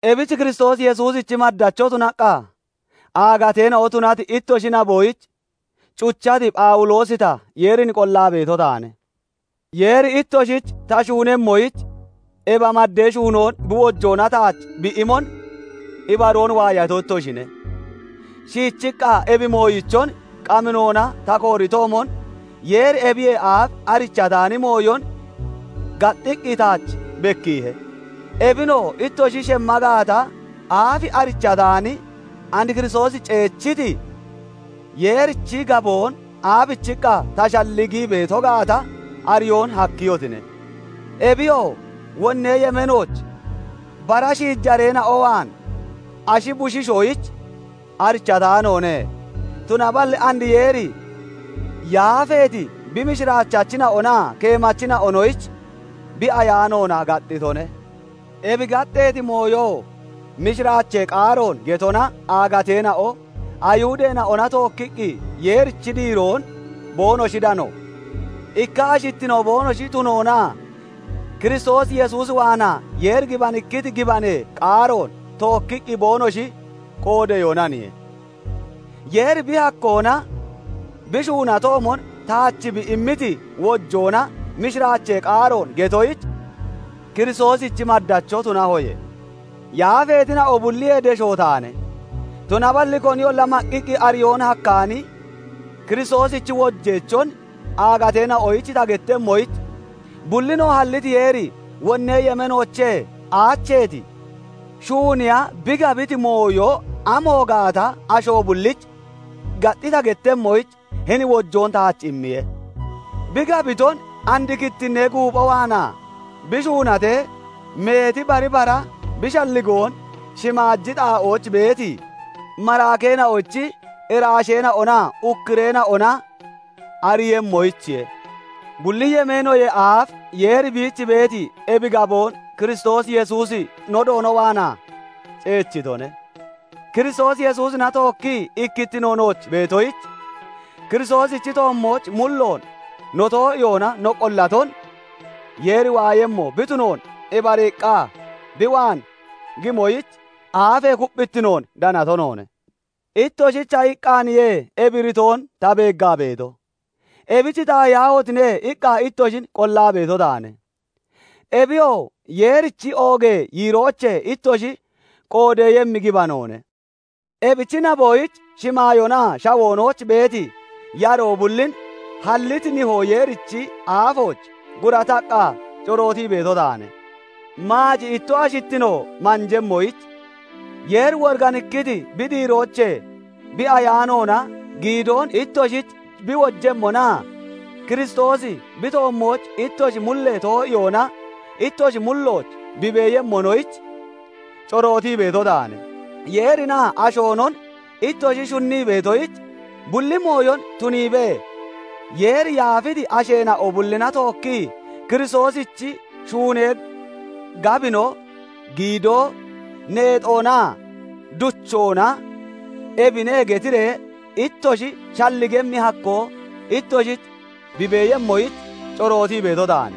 Ebich Kiristoos Yesuusichi maddacho tunaqqa aagateena'o tunati ittoshi naboyich cuchati Phawuloosi ta, Yeerin qollaa beeto taane. Yeeri ittoshich ta shuunemmoyich ebi maddee shuunoon bi wojoona taach bi imon ibaroon waayato ittoshine; shiichiqqa ebi mooyichon qaminona ta kooritoomon, Yeeri ebiyee aaf arichataani mooyon gaxxiqqi taach bekkiihe; ebinoo ittoshi shemma gaata aaf arichataani, and Kiristoosi ceechiti, Yeerichi gaboon aabichiqqa ta shalligii beeto gaata ariyoon hakkiyotine. Ebiyoo wonnee yemeenooch bara shiijareena'o waan ashi bushiishoyich arichataanoone; tunaballi and Yeeri yaafeeti bi mishiraachachina'onaa keemachina'onoyich bi Ayaanoona gaxxitone; ebi gaxxeeti mooyoo mishiraachee qaaroon getona aagateena'o Ayihudeena'ona tookkiqqi Yeerichi diiroon boonoshi dano, ikka ashittino boonoshi tunoonaa Kiristoos Yesuus waanaa Yeeri gibanikkiti gibanee qaaroon tookkiqqi boonoshi qoodeyoonaniye. Yeeri bi hakkoona bi shuunatoomon taach bi immiti wojoona mishiraachee qaaroon getoyich Kiristoosichi maddacho tunahoye. Yaafeetina'o bulliyee deshoo taane; tunaballi koniyolla maqqiqqi ariyoon hakkaani Kiristoosichi wojeechon aagateena'oyich ta gettemmoyich, bullinoo halliti Yeeri wonnee yemeenoochee aacheeti, shuuniya bi gabiti mooyo amo gaata asho bullich gaxxi ta gettemmoyich, hini wojoon taach immiye; bi gabiton and kittinnee guupho waanaa bi shuunatee, meeti bari bara bi shalligoon shimaaji xaa'ooch beeti maraakeena'ochi iraasheena'onaa ukkureena'ona ariiyemmoyichiye; bulli yemeenoyee aaf Yeeri biich beeti ebi gaboon Kiristoos Yesuusi no Doono waanaa ceechitone. Kiristoos Yesuusina tookkii ikkittino nooch beetoyich, Kiristoosichi toommooch mulloon no too'iyoona no qollaton Yeeri waayemmo bi tunoon ibariiqqa bi waan gimoyich aafee kupphittinoon danato noone. Ittoshicha iqqaaniye ebi iritoon ta beeggaa beeto; ebich "Taahiyaahotine!" iqqa ittoshin qollaa beeto taane; ebiyoo Yeerichi oogee yiiroochee ittoshi qoodeeyemmi gibanoone. Ebichi naboyich shimaayoonaa shawoonooch beeti yaroo bullin halliti Nihoo Yeerichi aafooch gurataqqa corootii beeto taane; maaci ittoshi ashittino manjemmoyich, Yeeri woriganikkiti bi diiroochee bi Ayaanoona giidoon ittoshich bi wojemmonaa Kiristoosi bi toommooch ittoshi mullee too'iyoona ittoshi mullooch bi beeyemmonoyich, corootii beeto taane; Yeerinaa ashoonon ittoshi shunnii beetoyich bulli mooyon tuniibee, Yeeri yaafiti asheena'o bullina tookki Kiristoosichi shunee gabino, gidoo, neexoonaa duchoona ebine getiree ittoshi shalligemmi hakkoo ittoshich bi beeyemmoyich corootii beeto taane;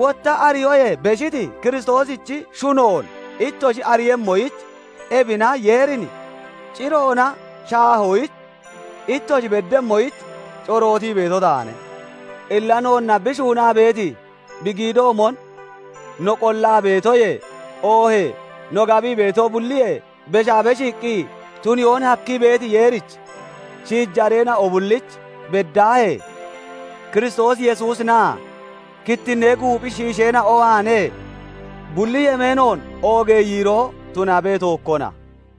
wotta ariyoyee beshiti Kiristoosichi shunoon ittoshi ariiyemmoyich, ebina Yeerin ciroona shaahoyich ittoshi beddemmoyich corootii beeto taane. Illa noonna bi shuunaa beeti bi giidoomon no qollaa beetoyee oohee no gabii beeto bulliyee beshaa beshiiqqi tuniyoon hakkii beeti Yeerich, shiijareena'o bulliich beddaahee Kiristoos Yesuusinaa kittinnee guuphi shiisheena'ona waanee bulli yemeenoon oogee yiiroo tunabe; tookkona.